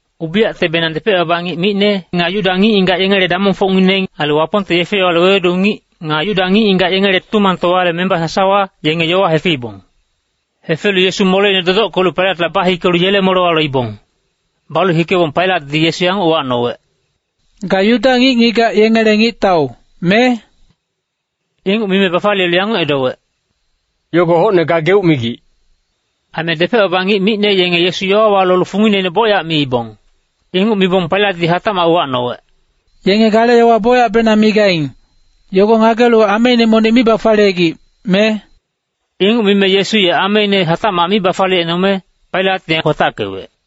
Ubiyactebenang depec-baba ngic micne, nga Yuda ngic-ngigac yengele damongfocngineng, ailu Wapongte yefe-yowale wewedu ngic, nga Yuda ngic-ngigac yengele Tutumangtowale memba sasawa, yenge yowa hefeibong. Hefelu Yesu moleine dodockelu Pailatla bahikelu yele molewa loibong. Balu hikebong Pailatdi Yesu yanguc uwacnowec, “Ga Yuda ngic-ngigac yengele ngictau, me?” Inguc mime bafaliyelu yanguc edowec, “Yogo hocne gageuc migic.” Aime depec-baba ngic micne yenge Yesu yowawa lolu fungineine bocyac miibong. Inguc mibong Pailatdi hatacmac uwacnowec, “Yenge gale yowa bocyacbenang migaing, yogo ngagelu ameine monic mi bafaliyegic, me?” Inguc mime Yesu ye ameine hatacmac mi bafaliyecnome, Pailat ye kwatackewec.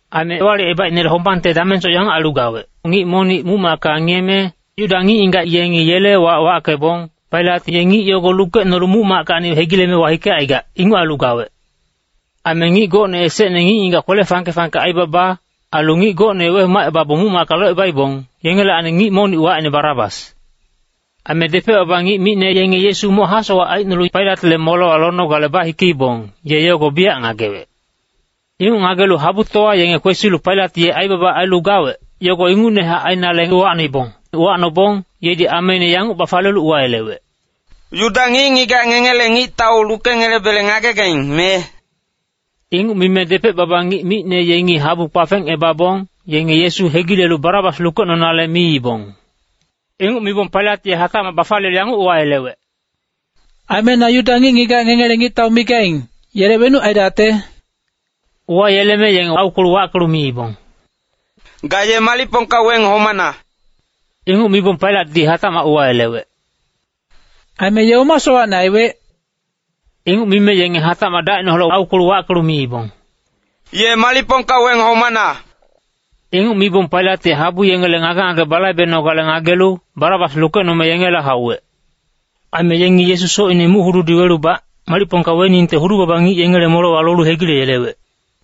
Aime Ewalicebaicnele hombangte damengsoc yanguc ailu gawec. Ngic monic muc-macka ngiyeme, Yuda ngic-ngigac yengi yele wac wackebong, Pailat ye ngic yogo lukecnolu muc-mackacni hegileme wahikecaigac, inguc ailu gawec. Aime ngic gocne esecne ngic-ngigac kwele fangke-fangke aibaba, ailu ngic gocne wehomacebabong muc-macka locebaibong, yengelacni ngic monic wacine Barabas. Aime depec-baba ngic micne yenge Yesu moc hasowac aicnolu Pailatle molewa lonogale bahikeibong, ye yogo biyac ngagewec. Inguc ngagelu habutowa yenge kwesilu Pailat ye aibaba ailu gawec, yogo ingucnehac ainale uwacnoibong. Uwacnobong yedi ameine yanguc bafaliyelu uwayelewec, “Yuda ngic-ngigac ngengele ngictau lukengelebele ngagegaing, me?” Inguc mime depec-baba ngic micne yengi habu kpafengebabong, yenge Yesu hegilelu Barabas lukecnonale miibong. Inguc mibong Pailat ye hatacmac bafaliyelu yanguc uwayelewec, “Aime na Yuda ngic-ngigac ngengele ngictau migaing, yele wenuc aidacte?” Uwayeleme yengi aukwelu wackelu miibong, “Ga ye malicpongka weng homana.” Inguc mibong Pailatdi hatacmac uwayelewec, “Aime ye oma sowacne aiwec?” Inguc mime yengi hatacmac dacineholec aukwelu wackelu miibong, “Ye malicpongka weng homana!” Inguc mibong Pailat ye habu yengele ngage-ngage balaibenogale ngagelu, Barabas lukecnome yengela hauwec. Aime yengi Yesu socine muc-hududi welubac, malicpongka weningte hudu-baba ngic yengele molewa lolu hegileyelewec.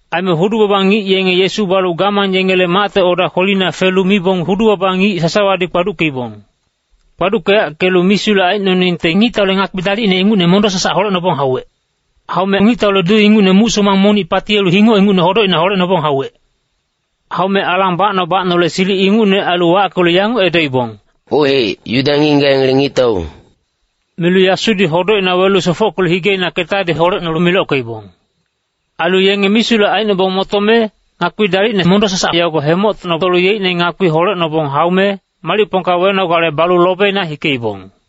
Aime hudu-baba ngic yenge Yesu balu gamang yengele macte oda kwelina felu mibong, hudu-baba ngic sasawadi kpaduckeibong. Kpaduckeyackelu misulec aicnoningte ngictaule ngakpi dalicne ingucne monic mondo-sasac holecnobong hauwec. Haume ngictaule duu ingucne muc-somang monic patiyelu hingoc ingucne hodocina holecnobong hauwec. Haume alang bacno-bacnole silic ingucne ailu wackelu yanguc edoibong, “Ohec, Yuda ngic-ngigac yengele ngictau.” Milu yasudi hodocina welu sofockelu higeina ketadi holecnolu milockeibong. Ailu yenge misulec aicnobong motome, ngakpi dalicne mondo-sasac yogo hemoctocnolu yeicne ngakpiine hatacmac holecnobong haume, malicpongka wenogale balu lobina hikeibong.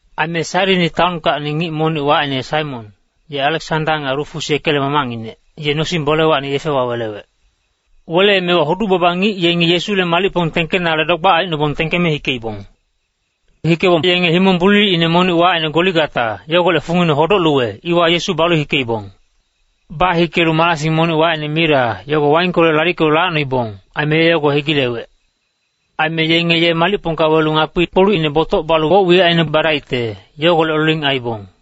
Aime Sairini taonkacni ngic monic wacine Saimon, ye Aleksanda nga Rufus yekele mamacnginec, ye nosing-bolewacni yefewa welewec. Weleemewa hudu-baba ngic yengi Yesule malicpong tengkenale dogbac aicnobong tengkeme hikeibong. Hikebong yenge himong bulilicine monic wacine Goligata, yogolec fungine Hodoc-luwe, iwa Yesu balu hikeibong. Bahikelu marasing monic wacine mira, yogo waingkolec lalickelu lacnoibong. Aime ye yogo hegilewec. Aime yenge ye malicpongka welu ngakpi-kpolucine botoc balu woc-wiyacine badaingte, yogolec loling aiibong.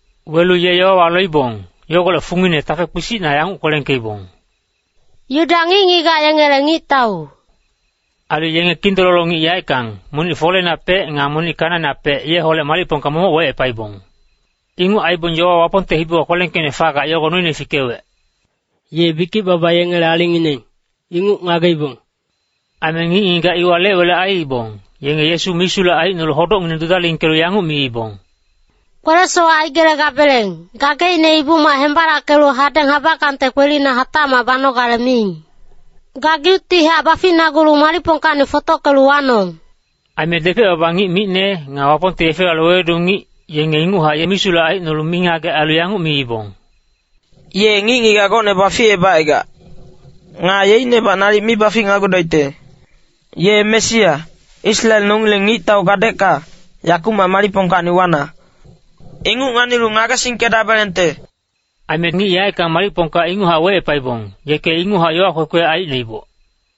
Welu ye yowawa loibong, yogolec fungine tafe kpisicna yanguc kwelengkeibong, “Yuda ngic-ngigac yengele ngictau.” Ailu yenge kindololo ngic yaeckang, monic foleinapec nga monic kanainapec yeholec malicpongka momoc wecepaibong. [Inguc aibong yowa Wapongte hibiwa kwelengkeicne fagac yogo noine fikewec, “Ye bikic-baba yengele alingngineng, inguc ngageibong.”] Aime ngic-ngigac iwa lec-welec aiibong, yenge Yesu misulec aicnolu hodocngineng dudalingkelu yanguc miibong, “Kwele-sowac aigelegabeleng, gageicne Ibu-mac hembalackelu hadeng habackangte kwelina hatacmac banogale miing. Gageuctihac baficnagulu malicpongkacni fotockelu wanong!” Aime depec-baba ngic micne, nga Wapongte yefe-yowale wewedu ngic, yenge inguchac ye misulec aicnolu mingagec ailu yanguc miibong, “Ye ngic-ngigac gocne baficebacaigac. Nga yeicnebac nalic mi baficnagudaicte. Ye Mesia, Israel nongileng ngictau gadecka, yakumac malicpongkacni wana. Inguc nganilu ngagesingkedabelengte.” Aime ngic yaeckang malicpongka inguchac wecepaibong, yeke inguchac yowa kwekwe aicnoiboc.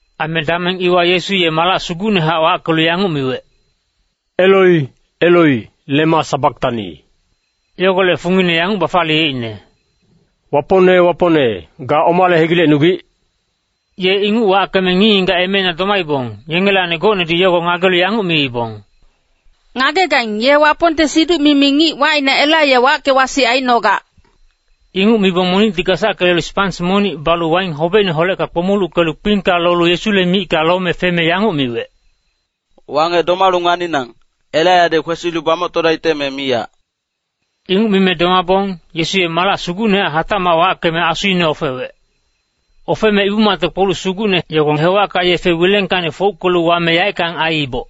Aime dameng iwa Yesu ye malac sugucnehac wackelu yanguc miwec, “Eloi, Eloi, lema sabaktani.” Yogolec fungine yanguc bafaliyeicne, “Wapongne Wapongne, ga omale hegilecnugic?” Ye inguc wackeme ngic-ngigac emeina domaibong, yengelacni gocnedi yowa yogo ngagelu yanguc miibong, “Ngagegaing, ye Wapongte siduc-mimi ngic wacine Elaiya wacke-wasic aicnogac.” Inguc mibong monicti gasacke lelu spans monic balu waing hobecineholecka kpomuluckelu kpingka lolu Yesule micka lome feme yanguc miwec, “Wangec domalu nganinang, Elaiyadi kwesilu bamoctodaicte me miyac!” Inguc mime domabong, Yesu ye malac sugucnehac hatacmac wackeme asuine ofewec. Ofeme Ibu-macte kpoluc sugucne yogo hewacka yefe wilengkacni fouckelu wame yaeckang aiiboc.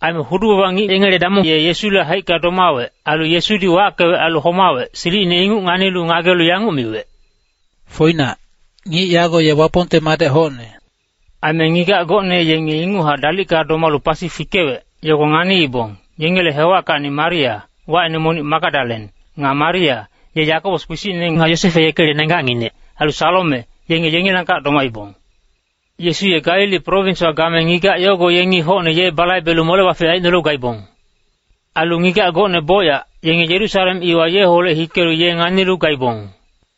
Aime hudu-baba ngic yengele damong ye Yesule haicka domawec. Ailu Yesudi wackewec ailu homawec, silicine inguc nganilu ngagelu yanguc miwec, “Foinac, ngic yago ye Wapongte madec hocne.” Aime ngigac gocne yenge inguchac dalicka domalu pasi fikewec, yogo nganiibong. Yengele hewackacni Maria, wacine monic Magadalen. Nga Maria, ye Yakobos kpisicne nga Yosefe yekele nenggacnginec. Ailu Salome, yenge yengilangkac domaibong. Yesu ye Galili prowinswa game ngigac yogo yengi hocne ye balaibelu mole-bafic aicnolu gaibong. Ailu ngigac gocne bocyac, yenge Yerusalem iwa yeholec hikelu ye nganilu gaibong.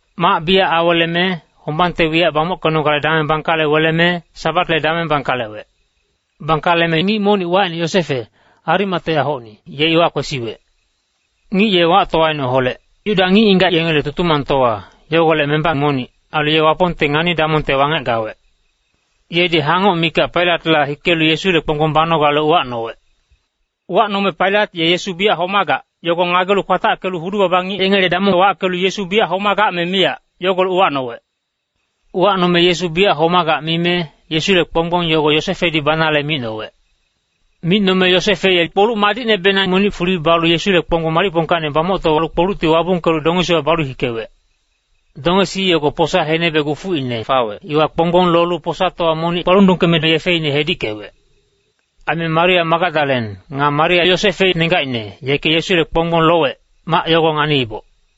Mac biyac aweleme, hombangte wiyac bamockenogale dameng bangkale weleme, Sabatle dameng bangkalewec. Bangkaleme ngic monic wacine Yosefe, Arimateahocni, ye iwa kwesiwec. Ngic ye wactowaineholec, Yuda ngic-ngigac yengele Tutumangtowa, yogolec memba monic. Ailu ye Wapongte ngani-damongte wangec gawec. Yedi hangoc mikac Pailatla hikelu Yesule kponggbong banogale uwacnowec. Uwacnome Pailat ye Yesu biyac homagac, yogo ngagelu kwatackelu hudu-baba ngic yengele damong wackelu Yesu biyac homagac me miyac, yogolec uwacnowec. Uwacnome Yesu biyac homagac mime, Yesule kponggbong yogo Yosefedi banale micnowec. Micnome Yosefe ye kpoluc madicnebenang monic fuli balu Yesule kponggbong malicpongkacni bamoctolu kpolucti wabungkelu dongesiwa balu hikewec. Dongesi yogo posa henebe gufuicna fawec, iwa kponggbong lolu posatowa monic kpalundungkeme yefine hedickewec. Aime Maria Magadalen, nga Maria Yosefe nenggacine, yeke Yesule kponggbong lowec, mac yogo nganiiboc.